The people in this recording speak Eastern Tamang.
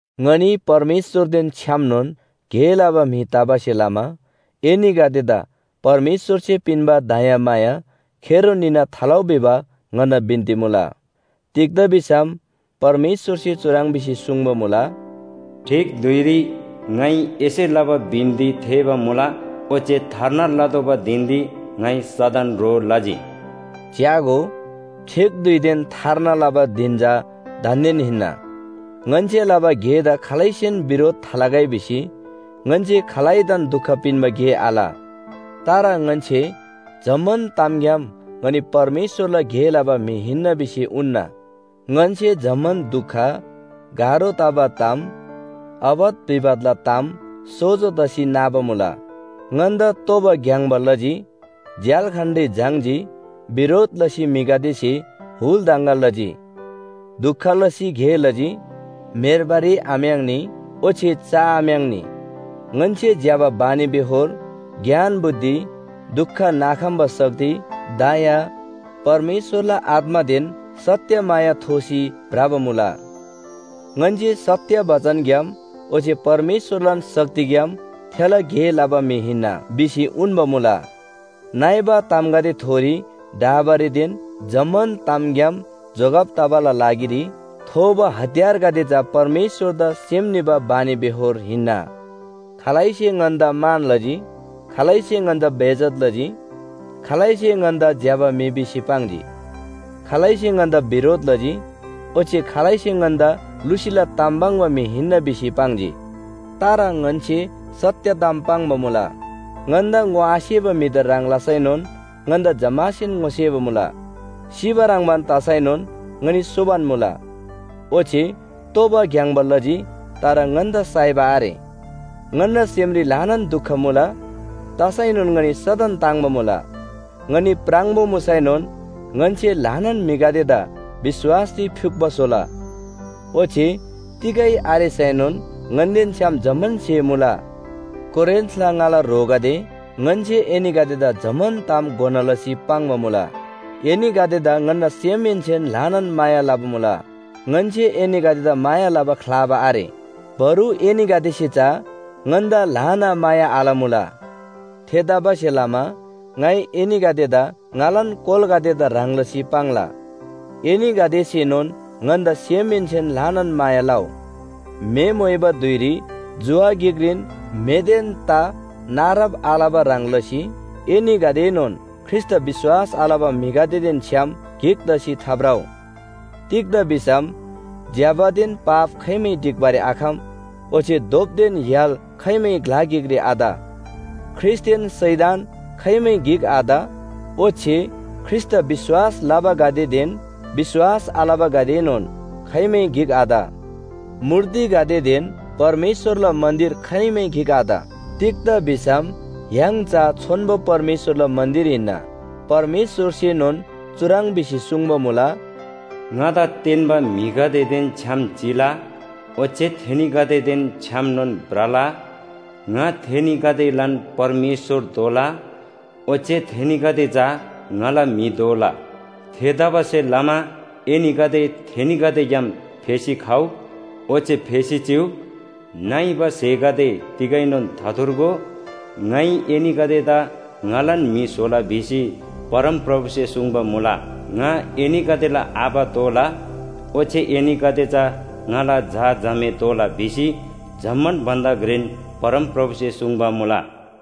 ङनी परमेश्‍वरदेन छ्‌यामनोन गे लबा म्‍हि तबासे लमा एनीगदेदा परमेश्‍वरसे पिन्‍बा दयामाया खेरो निना थालउ भिबा ङन्‍ना बिन्‍ती मुला। तिग्‍दा भिसम परमेश्‍वरसे चुह्रङ् भिसी सुङ्बा मुला, “ठीक धुइरी ङाइ एसे लबा बिन्‍ती थेःबा मुला, ओच्‍छे थार्ना लतोःबा धिनरी ङाइ सदन ह्रो लजी।” च्‍यागो, ठीक धुइदेन थार्ना लबा धिन चा दान्‍देन हिन्‍ना। ङन्‍से लबा गेदा खालैसेन बिरोध थालगै भिसी ङन्‍से खालैदान दुख पिन्‍बा गे आल। तर ङन्‍से जम्‍मान तामग्‍याम ङनी परमेश्‍वरला गे लबा म्‍हि हिन्‍ना भिसी उन्‍ना। ङन्‍से जम्‍मान दुख, गाह्रो तबा ताम, आपत विपतला ताम सोजो तसी नाबा मुला। ङन्‍दा तोबा ग्‍याङ्‍बा लजी, झ्‍याल्‍खानरी झाङ्‌जी, बिरोध लसी म्‍हिगदेसे हुल दङगा लजी, दुख लसी गे लजी, म्‍हेर्बारी आम्‍याङ्नी ओच्‍छे चआम्‍याङ्‌नी। ङन्‍से ज्‍यबा बानीबेहोर, ज्ञान बुद्धि, दुख नाखम्‍बा शक्ति, दया, परमेश्‍वरला आत्‍मादेन सत्‍य माया थोसी भ्रबा मुला। ङन्‍से सत्‍य बचनग्‍याम ओच्‍छे परमेश्‍वरलान शक्तिग्‍याम थेला गे लबा म्‍हि हिन्‍ना भिसी उन्‍बा मुला। नइबा तामगदेथोरी ढाबारीदेन जम्‍मान तामग्‍याम जोगब तबाला लागिरी थोबा हतियारगदे चा परमेश्‍वरदा सेम निबा बानीबेहोर हिन्‍ना। खालैसे ङन्‍दा मान लजी, खालैसे ङन्‍दा बेइज्‍जत लजी। खालैसे ङन्‍दा ज्‍यबा म्‍हि भिसी पाङ्जी, खालैसे ङन्‍दा बिरोध लजी। ओच्‍छे खालैसे ङन्‍दा लुसीला ताम पाङ्बा म्‍हि हिन्‍ना भिसी पाङ्जी। तर ङन्‍से सत्‍य ताम पाङ्बा मुला। ङन्‍दा ङोआसेबा म्‍हिदा ह्रङ् लसैनोन ङन्‍दा जम्‍मासेन ङोसेबा मुला। सिबा ह्रङ्‌बान तसैनोन ङनी सोबान मुला, ओच्‍छे तोबा ग्‍याङ्‍बा लजी तर ङन्‍दा साइबा आरे। ङन्‍ना सेमरी ल्‍हानान दुख मुला, तसैनोन ङनी सदन ताङ्‍बा मुला। ङनी प्राङबो मुसैनोन ङन्‍से ल्‍हानान म्‍हिगदेदा विश्‍वासरी फ्‍युक्‍पो स्‍होला। ओच्‍छे तिगै आरेसैनोन ङन्‍देन छ्‌याम जम्‍मान स्‍हे मुला। कोरिन्‍थला ङाला ह्रोगदे, ङन्‍से एनीगदेदा जम्‍मान ताम घोना लसी पाङ्बा मुला, एनीगदेदा ङन्‍ना सेमहेन्‍सेन ल्‍हानान माया लबा मुला। ङन्‍से एनीगदेदा माया लबा ख्‍लाबा आरे, बरु एनीगदेसे चा ङन्‍दा ल्‍हाना माया आलमुला। थेतबासेलमा ङाइ एनीगदेदा ङालान कोलागदेदा ह्रङ् लसी पाङ्ला, एनीगदेसेनोन ङन्‍दा सेमहेन्‍सेन ल्‍हानान माया लउ। म्‍हे मोइबा धुइरी जुवा गिकरीन म्‍हेदेन ता नारब आलबा ह्रङ् लसी एनीगदेएनोन ख्रीष्‍टदा विश्‍वास आलबा म्‍हिगदेदेन छ्‌याम गिक तसी थाभ्रउ। तिग्‍दा भिसम ज्‍यबादेन पाप खाइमै ढिक्‍बारी आखम ओच्‍छे धोपदेन य्‍हाल खाइमै ग्‍ला गिकरी आत। ख्रीष्‍टदेन शैतान खाइमै गिक आत ओच्‍छे ख्रीष्‍टदा विश्‍वास लबागदेदेन विश्‍वास आलबागदेएनोन खाइमै गिक आत। मूर्तिगदेदेन परमेश्‍वरला मन्‍दिर खाइमै गिक आत। तिग्‍दा भिसम य्‍हाङ चा छोन्‍बो परमेश्‍वरला मन्‍दिर हिन्‍ना। परमेश्‍वरसेनोन चुह्रङ् भिसी सुङ्बा मुला, “‘ङादा तेन्‍बा म्‍हिगदेदेन छ्‌याम चिला, ओच्‍छे थेनीगदेदेन छ्‌यामनोन भ्रला। ङा थेनीगदेलान परमेश्‍वर दोला, ओच्‍छे थेनीगदे चा ङाला म्‍हि दोला। थेतबासेलमा एनीगदे थेनीगदेग्‍याम फेसी खउ, ओच्‍छे फेसी चिउ। नइबा स्‍हेगदे तिगैनोन थाथुर्गो, ङाइ एनीगदेदा ङालान म्‍हि स्‍होला’ भिसी परमप्रभुसे सुङ्बा मुला।” “‘ङा एनीगदेला आबा दोला, ओच्‍छे एनीगदे चा ङाला झा झामे दोला’ भिसी जम्‍मान भन्‍दा घ्रेन परमप्रभुसे सुङ्बा मुला।”